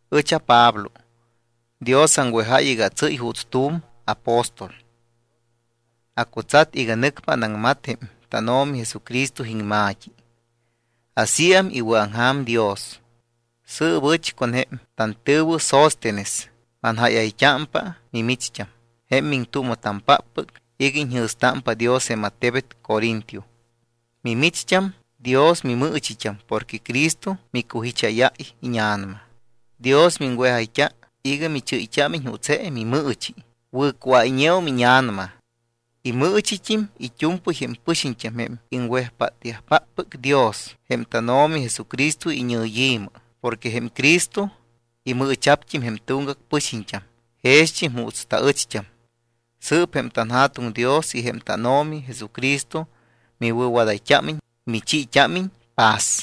Ɨch aPablo. Dios aŋwejáy iga atsɨ́y juuts tu̱m apóstol. Acutsat iga nɨcpa anaŋmat jém tánO̱mi Jesucristo iŋma̱t́i. Asíam iwɨ̱aŋja̱m Dios. Sɨɨp ɨch con jém tantɨ̱wɨ Sóstenes manjáyayt́ámpa mimicht́am, jém miŋtuuma̱tampáppɨc iga iñjɨ̱stámpa Dios jém attebet Corinto. Mimicht́am Dios mimɨɨchit́am porque Cristo micujicháyáy íña̱nama. Dios miŋwejayt́a iga michɨ́yt́ámiñ juuts je mimɨɨchi, wɨ̱cuáyñeum íña̱nama. Imɨɨchit́im it́u̱mpɨy jém pɨxiñt́am jém iŋwejpátyajpáppɨc Dios jém tánO̱mi Jesucristo iñɨyi̱mɨ porque jém Cristo imɨɨcha̱pt́im jém tuŋgac pɨxiñt́am jext́im juuts taɨcht́am. Sɨɨp jém tanJa̱tuŋ Dios y jém tánO̱mi Jesucristo miwɨ̱wadayt́ámiñ, michiit́ámiñ paz.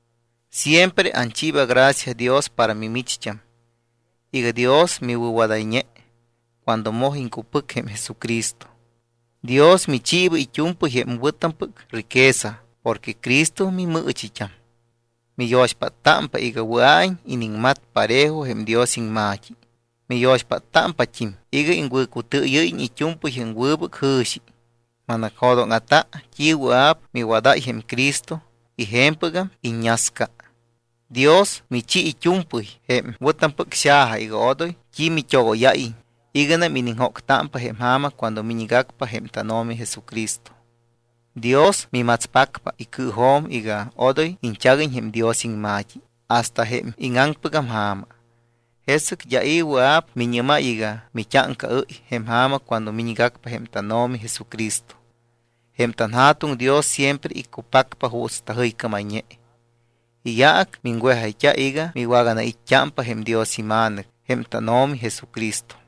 Siempre anchiiba gracia Dios para mimicht́am iga Dios miwɨ̱wadayñe cuando moj iŋcupɨc jém Jesucristo. Dios michiiba it́u̱mpɨy jém wɨ̱tampɨc riqueza porque Cristo mimɨɨchit́am. Miyo̱xpáttámpa iga wɨa̱iñ iniŋmat parejo jém Dios iŋma̱t́i. Miyo̱xpáttámpat́im iga iŋwɨ̱cutɨɨyɨ́yiñ it́u̱mpɨy jém wɨbɨc jɨ̱xi. Manacjo̱dóŋa̱ta t́i wɨa̱p miwadáy jém Cristo y je̱mpɨgam iññasca. Dios michi it́u̱mpɨy jém wɨ̱tampɨc xaja iga odoy t́i mit́ogóyáyiñ iganam iniŋjóctámpa jém ja̱ma cuando miñgacpa jém tánO̱mi Jesucristo. Dios mimatspacpa icɨɨjo̱m iga odoy iñchaguiñ jém Dios iŋma̱t́i hasta jém íŋaŋpɨgam ja̱ma. Jesɨc d́a i̱ wɨa̱p miñɨ́máy iga mit́áŋcaɨ́y jém ja̱ma cuando miñgacpa jém tánO̱mi Jesucristo. Jém tanJa̱tuŋ Dios siempre iccupacpa juuts tajɨycámayñe. Iyaac miŋwejayt́a iga miwaganait́t́ámpa jém Dios iMa̱nɨc jém tánO̱mi Jesucristo.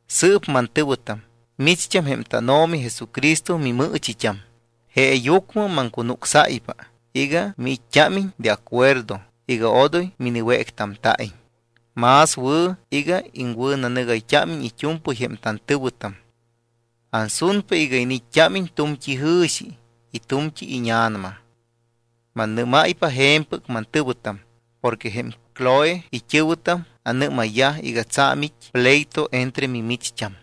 Sɨɨp, mantɨ̱wɨtam, micht́am jém tánO̱mi Jesucristo mimɨɨchit́am, jeeyucmɨ maŋcunucsáypa iga miit́t́ámiñ de acuerdo iga odoy miniwéctamta̱iñ. Más wɨ̱ iga iŋwɨ̱nanɨgayt́ámiñ it́u̱mpɨy jém tantɨ̱wɨtam. Ansunpa iga iniit́t́ámiñ tu̱mt́i jɨ̱xi y tu̱mt́i íña̱nama. Mannɨ́máypa je̱mpɨc, mantɨ̱wɨtam, porque jém Cloe it́ɨ̱wɨtam anɨ́mayyaj iga tsa̱m it́ pleito entre mimicht́am.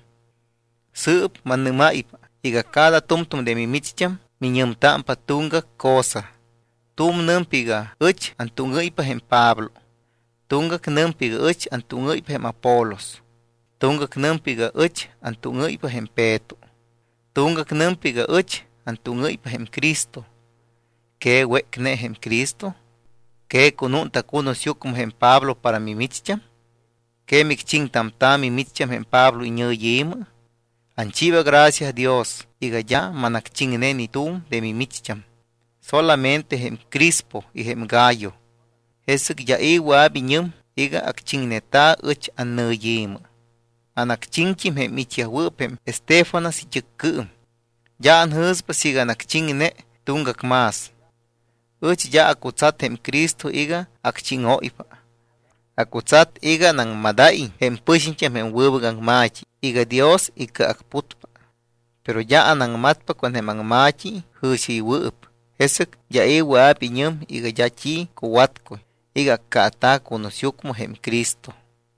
Sɨɨp mannɨ́máypa iga cada tu̱mtu̱m de mimicht́am miñɨmtámpa tuŋgac cosa. Tu̱m nɨmpa iga: “Ɨch antúŋɨ́ypa jém Pablo.” Tuŋgac nɨmpa iga: “Ɨch antúŋɨ́ypa jém Apolos.” Tuŋgac nɨmpa iga: “Ɨch antúŋɨ́ypa jém Peto.” Tuŋgac nɨmpa iga: “Ɨch antúŋɨ́ypa jém Cristo.” ¿Que wécne jém Cristo? ¿Que cunúnta̱ cunusyucmɨ jém Pablo para mimicht́am? ¿Que micchiŋtamta̱ mimicht́am jém Pablo iñɨyi̱mɨ? Anchiiba gracia Dios iga d́a manacchiŋne ni tu̱m de mimicht́am, solamente jém Crispo y jém Gayo. Jesɨc d́a i̱ wɨa̱p iñɨm iga acchiŋneta̱ ɨch annɨyi̱mɨ. Anacchiŋt́im jém it́yajwɨɨp jém Estéfanas it́ɨccɨɨm. D́a anjɨ̱spa siiga anacchiŋne tuŋgac más. Ɨch d́a acutsat jém Cristo iga acchíŋóypa. Acutsat iga anaŋmadáyiñ jém pɨxiñt́am jém wɨbɨc aŋma̱t́i iga Dios icɨacputpa. Pero d́a anaŋmatpa con jém aŋma̱t́i jɨ̱xiɨywɨɨp, jesɨc d́a i̱ wɨa̱p iñɨm iga d́a t́i cuwatcuy iga accaata̱ cunusyucmɨ jém Cristo.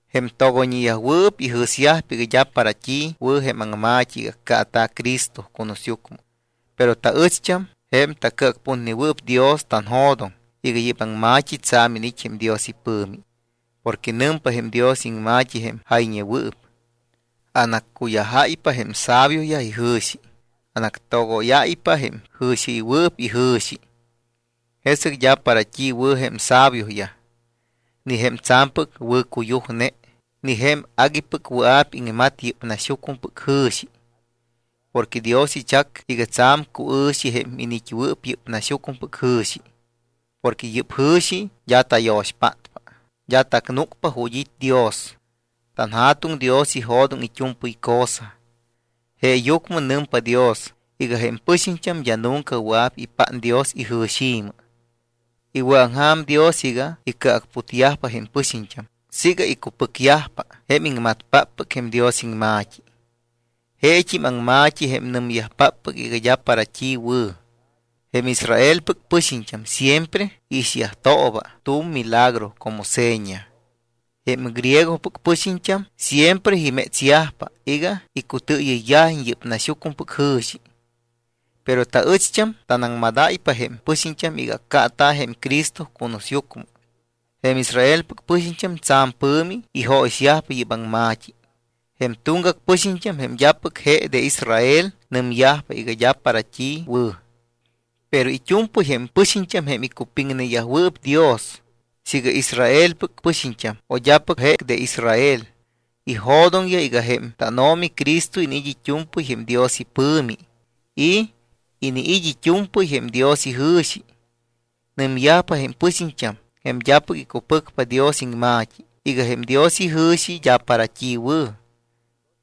Jém togoyñeyajwɨɨp ijɨ̱syajpa iga d́a para t́i wɨ̱ jém aŋma̱t́i iga accaata̱ Cristo cunusyucmɨ. Pero taɨcht́am, jém tacɨacputnewɨɨp Dios, tanjo̱doŋ iga yɨ́p aŋma̱t́i tsa̱m iniit́ jém Dios ipɨ̱mi. Porque nɨmpa jém Dios iŋma̱t́i jém jayñewɨɨp: Anaccuyajáypa jém sabioyaj ijɨ̱xi. Anactogóyáypa jém jɨ̱xiɨywɨɨp ijɨ̱xi. Jesɨc d́a para t́i wɨ̱ jém sabioyaj, ni jém tsa̱mpɨc wɨ̱cuyujne, ni jém aguipɨc wɨa̱p iŋmat yɨ́p naxyucmɨpɨc jɨ̱xi. Porque Dios ichac iga tsa̱m cuɨ̱xi jém iniit́wɨɨp yɨ́p naxyucmɨpɨc jɨ̱xi, porque yɨ́p jɨ̱xi d́a tayo̱xpátpa, d́a tacnúcpa ju̱t́ it́ Dios. TanJa̱tuŋ Dios ijo̱doŋ it́u̱mpɨy cosa. Jeeyucmɨ nɨmpa Dios iga jém pɨxiñt́am d́a nunca wɨa̱p ipát Dios ijɨ̱xi̱mɨ. Iwɨ̱aŋja̱m Dios iga icɨacputyajpa jém pɨxiñt́am siiga icupɨcyajpa jém iŋmatpáppɨc jém Dios iŋma̱t́i. Jeet́im aŋma̱t́i, jém nɨmyajpáppɨc iga d́a para t́i wɨ̱. Jém Israelpɨc pɨxiñt́am siempre iixyajt́ooba tu̱m milagro como seña. Jém griegopɨc pɨxiñt́am siempre imétsyajpa iga icutɨɨyɨyyajiñ yɨ́p naxyucmɨpɨc jɨ̱xi. Pero taɨcht́am tanaŋmadáypa jém pɨxiñt́am iga accaata̱ jém Cristo cunusyucmɨ. Jém Israelpɨc pɨxiñt́am tsa̱m pɨ̱mi ijóyixyajpa yɨ́p aŋma̱t́i. Jém tuŋgac pɨxiñt́am jém d́apɨc je de Israel nɨmyajpa iga d́a para t́i wɨ̱. Pero it́u̱mpɨy jém pɨxiñt́am jém icupiŋneyajwɨɨp Dios, siiga Israelpɨc pɨxiñt́am o d́apɨc je de Israel, ijo̱doŋyaj iga jém tánO̱mi Cristo iniit́ it́u̱mpɨy jém Dios ipɨ̱mi y iniit́ it́u̱mpɨy jém Dios ijɨ̱xi. Nɨmyajpa jém pɨxiñt́am, jém d́apɨc icupɨcpa Dios iŋma̱t́i, iga jém Dios ijɨ̱xi d́a para t́i wɨ̱.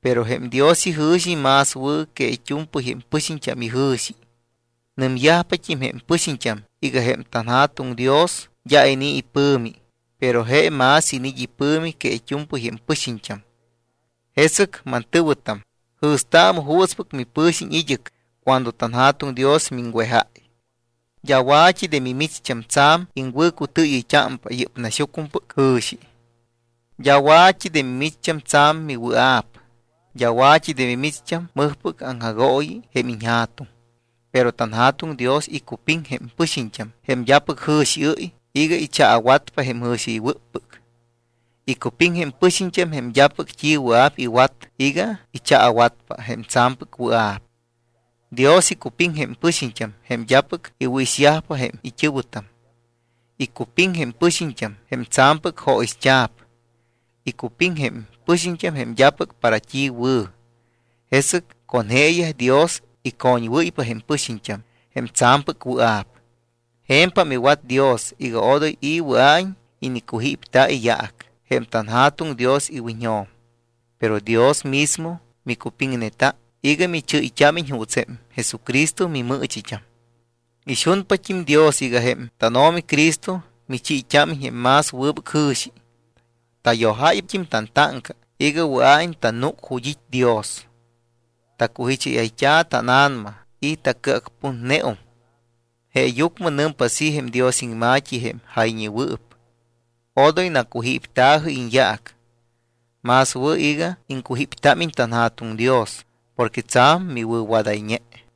Pero jém Dios ijɨ̱xi más wɨ̱ que it́u̱mpɨy jém pɨxiñt́am ijɨ̱xi. Nɨmyajpat́im jém pɨxiñt́am iga jém tanJa̱tuŋ Dios d́a inii̱ ipɨ̱mi, pero je más iniit́ ipɨ̱mi que it́u̱mpɨy jém pɨxiñt́am. Jesɨc, mantɨ̱wɨtam, jɨ̱staamɨ juutspɨc mipɨ̱xiñ id́ɨc cuando tanJa̱tuŋ Dios miŋwejáy. D́a wa̱t́i de mimicht́am tsa̱m iŋwɨ̱cutɨɨyɨyt́ámpa yɨ́p naxyucmɨpɨc jɨ̱xi. D́a wa̱t́i de mimicht́am tsa̱m miwɨa̱p. D́a wa̱t́i de mimicht́am mɨjpɨc aŋjagooyi jém iñja̱tuŋ. Pero tanJa̱tuŋ Dios icupiŋ jém pɨxiñt́am jém d́apɨc jɨ̱xiɨ́y iga ichaawatpa jém jɨ̱xiɨywɨ́ppɨc. Icupiŋ jém pɨxiñt́am jém d́apɨc t́i wɨa̱p iwat iga ichaawatpa jém tsa̱mpɨc wɨa̱p. Dios icupiŋ jém pɨxiñt́am jém d́apɨc iwɨ̱ixpa jém it́ɨ̱wɨtam. Icupiŋ jém pɨxiñt́am jém tsa̱mpɨc jóyixt́a̱p. Icupiŋ jém pɨxiñt́am jém d́apɨc para t́i wɨ̱. Jesɨc con jeeyaj Dios icoñwɨ́ypa jém pɨxiñt́am jém tsa̱mpɨc wɨa̱p. Je̱mpam iwat Dios iga odoy i̱ wɨa̱iñ inicujípta̱ iyaac jém tanJa̱tuŋ Dios iwiñjo̱m. Pero Dios mismo micupiŋneta iga michɨ́yt́ámiñ juuts jém Jesucristo mimɨɨchit́am. Ixunpat́im Dios iga jém tánO̱mi Cristo michiit́ámiñ jém más wɨbɨc jɨ̱xi. Tayojáyt́im tantáŋca iga wɨa̱iñ tanúc ju̱t́ it́ Dios. Tacujicháyayt́a tána̱nama y tacɨacputneum. Jeeyucmɨ nɨmpa así jém Dios iŋma̱t́i jém jayñewɨɨp: “Odoy nacujípta̱jɨ iñyaac. Más wɨ̱ iga iŋcujíptámiñ tanJa̱tuŋ Dios porque tsa̱m miwɨ̱wadayñe.”